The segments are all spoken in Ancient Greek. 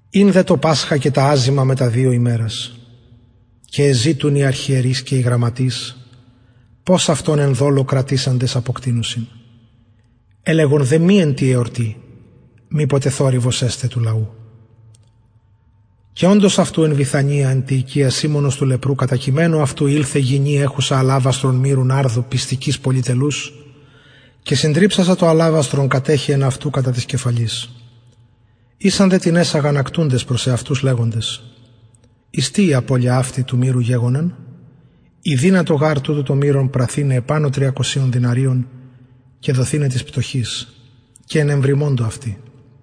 ην δε το πασχα και τα αζυμα μετα δυο ημερας και εζητουν οι αρχιερεις και οι γραμματεις πως αυτον εν δολω κρατησαντες αποκτεινωσιν ελεγον δε μη εν τη εορτη μηποτε θορυβος εσται του λαου και οντος αυτου εν βηθανια εν τη οικια σιμωνος του λεπρου κατακειμενου αυτου ηλθεν γυνη εχουσα αλαβαστρον μυρου ναρδου πιστικης πολυτελους και συντριψασα το αλαβαστρον κατεχεεν αυτου κατα της κεφαλης ησαν δε τινες αγανακτουντες προς εαυτους και λεγοντες εις τι η απωλεια αυτη του μυρου γεγονεν ηδυνατο γαρ τουτο πραθηναι επανω τριακοσιων δηναριων και δοθηναι τοις πτωχοις και ενεβριμωντο αυτη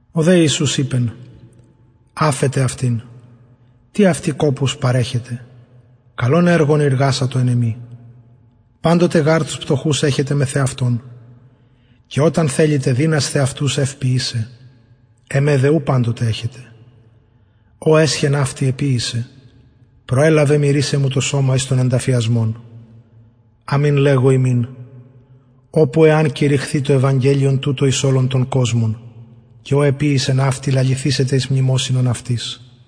ο δε ιησους ειπεν αφετε αυτην τι αυτη κοπους παρεχετε καλον εργον ειργασατο εν εμοι παντοτε γαρ τους πτωχους εχετε μεθ εαυτων και οταν θελητε δυνασθε αυτους ευ ποιησαι εμε δε ου παντοτε εχετε ο εσχεν αυτη εποιησεν προελαβεν μυρισαι μου το σωμα εις τον ενταφιασμον αμην λεγω υμιν οπου εαν κηρυχθη το ευαγγελιον τουτο εις ολον τον κοσμον και ο εποιησεν αυτη λαληθησεται εις μνημοσυνον αυτης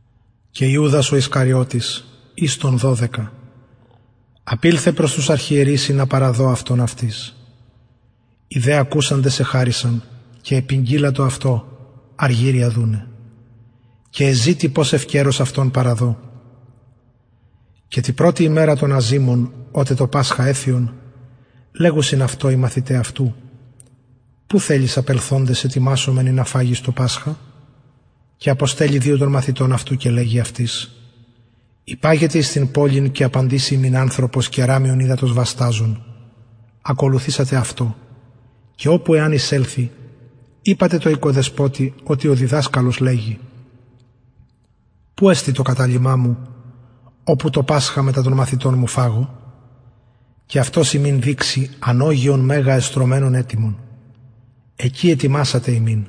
και ο ιουδας ο ισκαριωτης εις των δωδεκα απηλθεν προς τους αρχιερεις ινα παραδω αυτον αυτοις οι δε ακουσαντες εχαρησαν και επηγγειλαντο αυτω αργυριον δουναι και εζητει πως ευκαιρως αυτον παραδω και τη πρωτη ημερα των αζυμων οτε το πασχα εθυον λεγουσιν αυτω οι μαθηται αυτου που θελεις απελθοντες ετοιμασωμεν ινα φαγης το πασχα και αποστελλει δυο των μαθητων αυτου και λεγει αυτοις υπαγετε εις την πολιν και απαντησει υμιν ανθρωπος κεραμιον υδατος βασταζων ακολουθησατε αυτω και οπου εαν εισελθη ειπατε τω οικοδεσποτη οτι ο διδασκαλος λεγει που εστιν το καταλυμα οπου το πασχα μετα των μαθητων μου φαγω και αυτος υμιν δειξει ανωγεον μεγα εστρωμενον ετοιμον εκει ετοιμασατε ημιν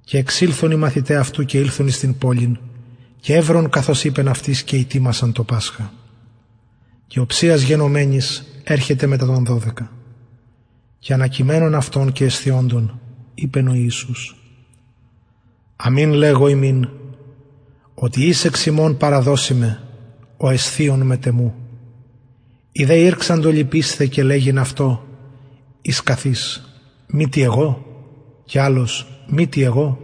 και εξηλθον οι μαθηται αυτου και ηλθον εις την πολιν και ευρον καθως ειπεν αυτοις και ητοιμασαν το πασχα και οψιας γενομενης ερχεται μετα των δωδεκα και ανακειμενων αυτων και εσθιοντων ειπεν ο ιησους αμην λεγω υμιν οτι εις εξ υμων παραδωσει με ο εσθιων μετ εμου οι δε ηρξαντο λυπεισθαι και λεγειν αυτω εις καθ εις μητι εγω και αλλος μητι εγω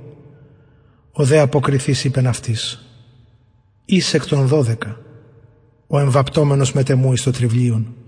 ο δε αποκριθεις ειπεν αυτοις εις εκ των δωδεκα ο εμβαπτομενος μετ εμου εις το τρυβλιον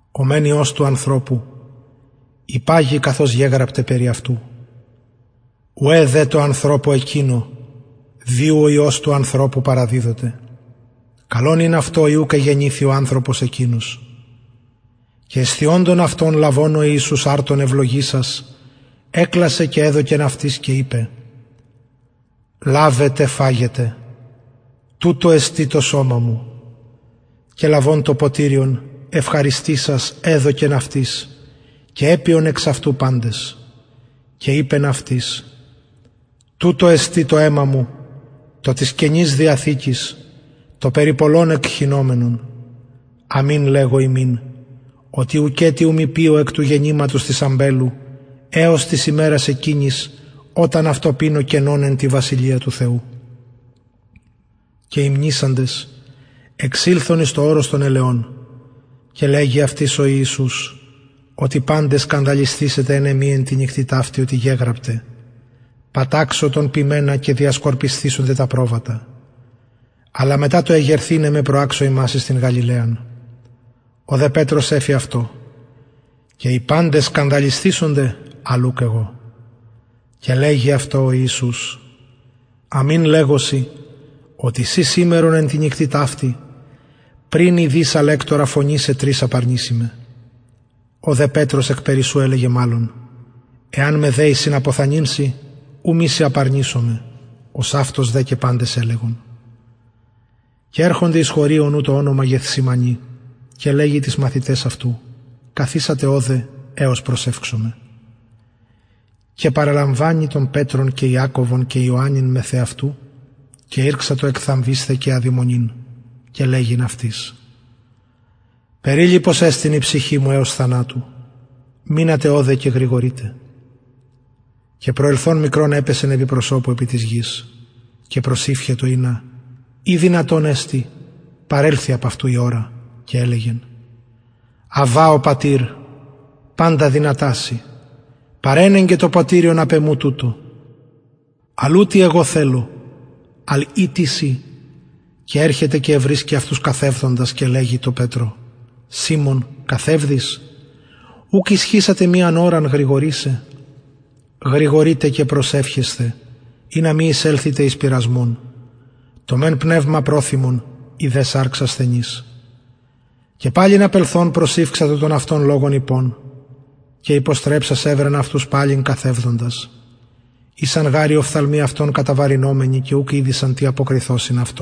ο μεν υιος του ανθρωπου υπαγει καθως γεγραπται περι αυτου ουαι δε τω ανθρωπω εκεινω δι ου ο υιος του ανθρωπου παραδιδοται καλον ην αυτω ει ουκ εγεννηθη ο ανθρωπος εκεινος και εσθιοντων αυτων λαβων ο ιησους αρτον ευλογησας εκλασεν και εδωκεν αυτοις και ειπεν λαβετε φαγετε τουτο εστιν το σωμα μου και λαβων το ποτηριον ευχαριστησας εδωκεν αυτοις και επιον εξ αυτου παντες και ειπεν αυτοις τουτο εστιν το αιμα μου το της καινης διαθηκης το περι πολλων εκχυνομενον αμην λεγω υμιν οτι ουκετι ου μη πιω εκ του γενηματος της αμπελου εως της ημερας εκεινης οταν αυτο πινω καινον εν τη βασιλεια του θεου και υμνησαντες εξηλθον εις το ορος των ελαιων και λεγει αυτοις ο ιησους οτι παντες σκανδαλισθησεσθε εν εμοι εν τη νυκτι ταυτη οτι γεγραπται παταξω τον ποιμενα και διασκορπισθησεται τα προβατα αλλα μετα το εγερθηναι με προαξω υμας εις την γαλιλαιαν ο δε πετρος εφη αυτω και ει παντες σκανδαλισθησονται αλλ ουκ εγω και λεγει αυτω ο ιησους αμην λεγω σοι οτι συ σημερον εν τη νυκτι ταυτη πριν η δις αλεκτορα φωνησαι τρις απαρνηση με ο δε εκπερισσου ελεγεν μαλλον εαν με δεη συναποθανειν σοι ου μη σε απαρνησωμαι ωσαυτως δε και παντες ελεγον και ερχονται εις χωριον ου το ονομα γεθσημανη και λεγει τοις μαθηταις αυτου καθισατε ωδε εως προσευξωμαι και παραλαμβανει τον πετρον και ιακωβον και ιωαννην μεθ εαυτου και ηρξατο εκθαμβεισθαι και αδημονειν και λεγει αυτοις περιλυπος εστιν η ψυχη μου εως θανατου μεινατε ωδε και γρηγορειτε και προσελθων μικρον επεσεν επι της γης και προσηυχετο ινα ει δυνατον εστιν παρελθη απ αυτου η ωρα και ελεγεν αββα ο πατηρ παντα δυνατα σοι παρενεγκε το ποτηριον απ εμου τουτο αλλ ου τι εγω θελω αλλα τι συ και ερχεται και ευρισκει αυτους καθευδοντας και λεγει τω πετρω σιμων καθευδεις ουκ ισχυσας μιαν ωραν γρηγορησαι γρηγορειτε και προσευχεσθε ινα μη εισελθητε εις πειρασμον το μεν πνευμα προθυμον η δε σαρξ ασθενης και παλιν απελθων προσηυξατο τον αυτον λογον ειπων και υποστρεψας ευρεν αυτους παλιν καθευδοντας ησαν γαρ οι οφθαλμοι αυτων βεβαρημενοι και ουκ ηδεισαν τι αυτω αποκριθωσιν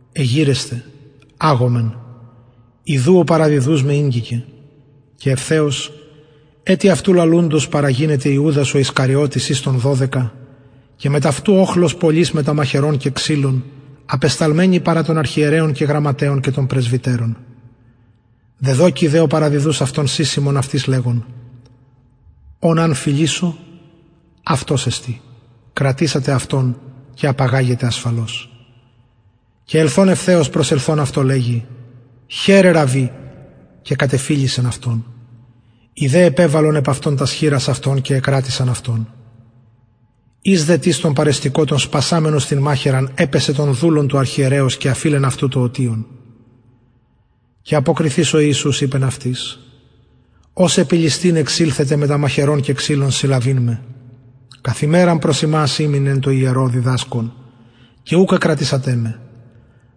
εγειρεσθε αγωμεν ιδου ο παραδιδους με ηγγικεν και ευθεως ετι αυτου λαλουντος παραγινεται ιουδας εις ων των δωδεκα και μετ αυτου οχλος πολυς μετα μαχαιρων και ξυλων παρα των αρχιερεων και των γραμματεων και των πρεσβυτερων δεδωκει δε ο παραδιδους αυτον συσσημον αυτοις λεγων ον αν φιλησω αυτος εστιν κρατησατε αυτον και απαγαγετε ασφαλως και ελθων ευθεως προσελθων αυτω λεγει αυτω ραββι ραββι και κατεφιλησεν αυτον οι δε επεβαλον επ αυτον τας χειρας αυτων και εκρατησαν αυτον εις δε τις των παρεστηκοτων σπασαμενος την μαχαιραν επαισεν τον δουλον του αρχιερεως και αφειλεν αυτου το ωτιον και αποκριθεις ο ιησους ειπεν αυτοις ως επι ληστην εξηλθετε μετα μαχαιρων και ξυλων συλλαβειν με καθ ημεραν ημην προς υμας εν τω ιερω διδασκων και ουκ εκρατησατε με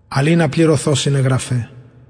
αλλ ινα πληρωθωσιν αι γραφαι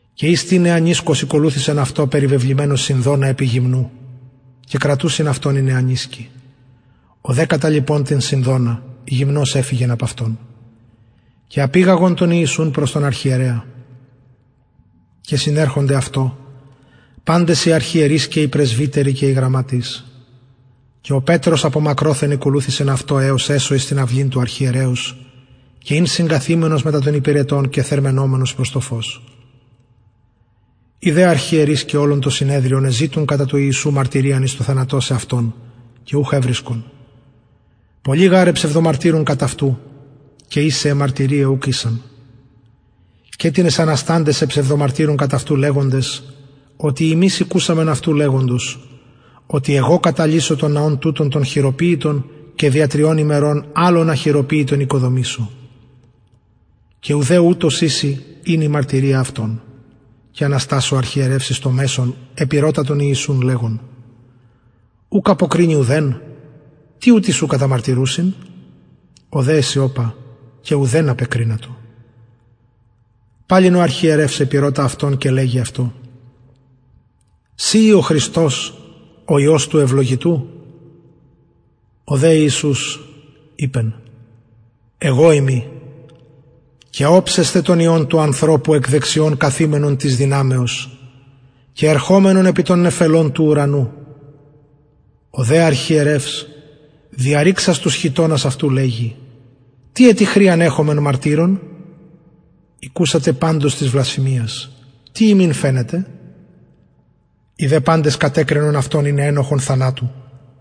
και εις τις νεανισκος ηκολουθησεν αυτω περιβεβλημενος σινδονα επι γυμνου και κρατουσιν αυτον οι νεανισκοι ο δε καταλιπων την σινδονα γυμνος εφυγεν απ αυτων και απηγαγον τον ιησουν προς τον αρχιερεα και συνερχονται αυτω παντες οι αρχιερεις και οι πρεσβυτεροι και οι γραμματεις και ο πετρος απο μακροθεν ηκολουθησεν αυτω εως εσω εις την αυλην του αρχιερεως και ην συγκαθημενος μετα των υπηρετων και θερμαινομενος προς το φως οι δε αρχιερεις και ολον το συνεδριον εζητουν κατα του ιησου μαρτυριαν εις το θανατωσαι αυτον και ουχ ευρισκον πολλοι γαρ εψευδομαρτυρουν κατ αυτου και ισαι αι μαρτυριαι ουκ ησαν και τινες ανασταντες εψευδομαρτυρουν κατ αυτου λεγοντες οτι ημεις ηκουσαμεν αυτου λεγοντος οτι εγω καταλυσω τον ναον τουτον τον χειροποιητον και δια τριων ημερων αλλον αχειροποιητον οικοδομησω και ουδε ουτως ιση ην η μαρτυρια αυτων και αναστας ο αρχιερευς εις μεσον επηρωτησεν τον ιησουν λεγων ουκ αποκρινη ουδεν τι ουτοι σου καταμαρτυρουσιν ο δε εσιωπα και ουδεν απεκρινατο παλιν ο αρχιερευς επηρωτα αυτον και λεγει αυτω συ ει ο χριστος ο υιος του ευλογητου ο δε ιησους ειπεν εγω ειμι και οψεσθε τον υιον του ανθρωπου εκ δεξιων καθημενον της δυναμεως και ερχομενον μετα των νεφελων του ουρανου ο δε αρχιερευς διαρρηξας τους χιτωνας αυτου λεγει τι ετι χρειαν εχομεν μαρτυρων ηκουσατε της βλασφημιας τι υμιν φαινεται οι δε παντες κατεκριναν αυτον ειναι ενοχον θανατου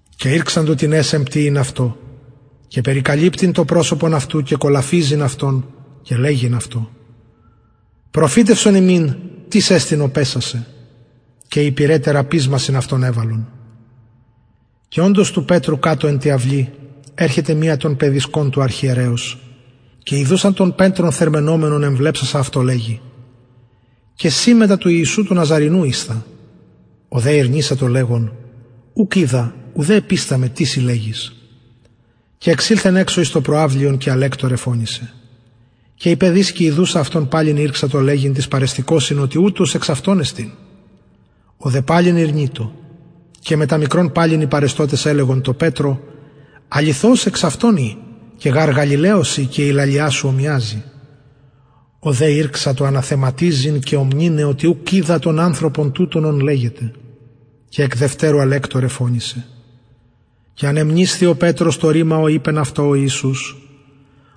και ηρξαντο τινες εμπτυειν αυτω και περικαλυπτειν το προσωπον αυτου και κολαφιζειν αυτον και λεγειν αυτω προφητευσον και οι υπηρεται ραπισμασιν αυτον εβαλλον και οντος του πετρου εν τη αυλη κατω ερχεται μια των παιδισκων του αρχιερεως και ιδουσα τον πετρον θερμαινομενον εμβλεψασα αυτω λεγει και συ μετα του ναζαρηνου ιησου ησθα ο δε ηρνησατο λεγων ουκ οιδα ουδε επισταμαι τι συ λεγεις και εξηλθεν εξω εις το προαυλιον και αλεκτωρ εφωνησεν και η παιδισκη ιδουσα αυτον παλιν ηρξατο λεγειν τοις παρεστηκοσιν οτι ουτος εξ αυτων εστιν ο δε παλιν ηρνειτο και μετα μικρον παλιν οι παρεστωτες ελεγον τω πετρω αληθως εξ αυτων ει και γαρ γαλιλαιος ει και η λαλια σου ομοιαζει ο δε ηρξατο αναθεματιζειν και ομνυναι οτι ουκ οιδα τον ανθρωπον τουτον ον λεγετε και εκ δευτερου αλεκτωρ εφωνησεν και ανεμνησθη ο πετρος το ρημα ο ειπεν αυτω ο ιησους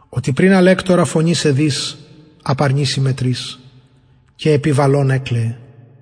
οτι πριν αλεκτορα φωνησαι δις απαρνηση με τρις και επιβαλων εκλαιεν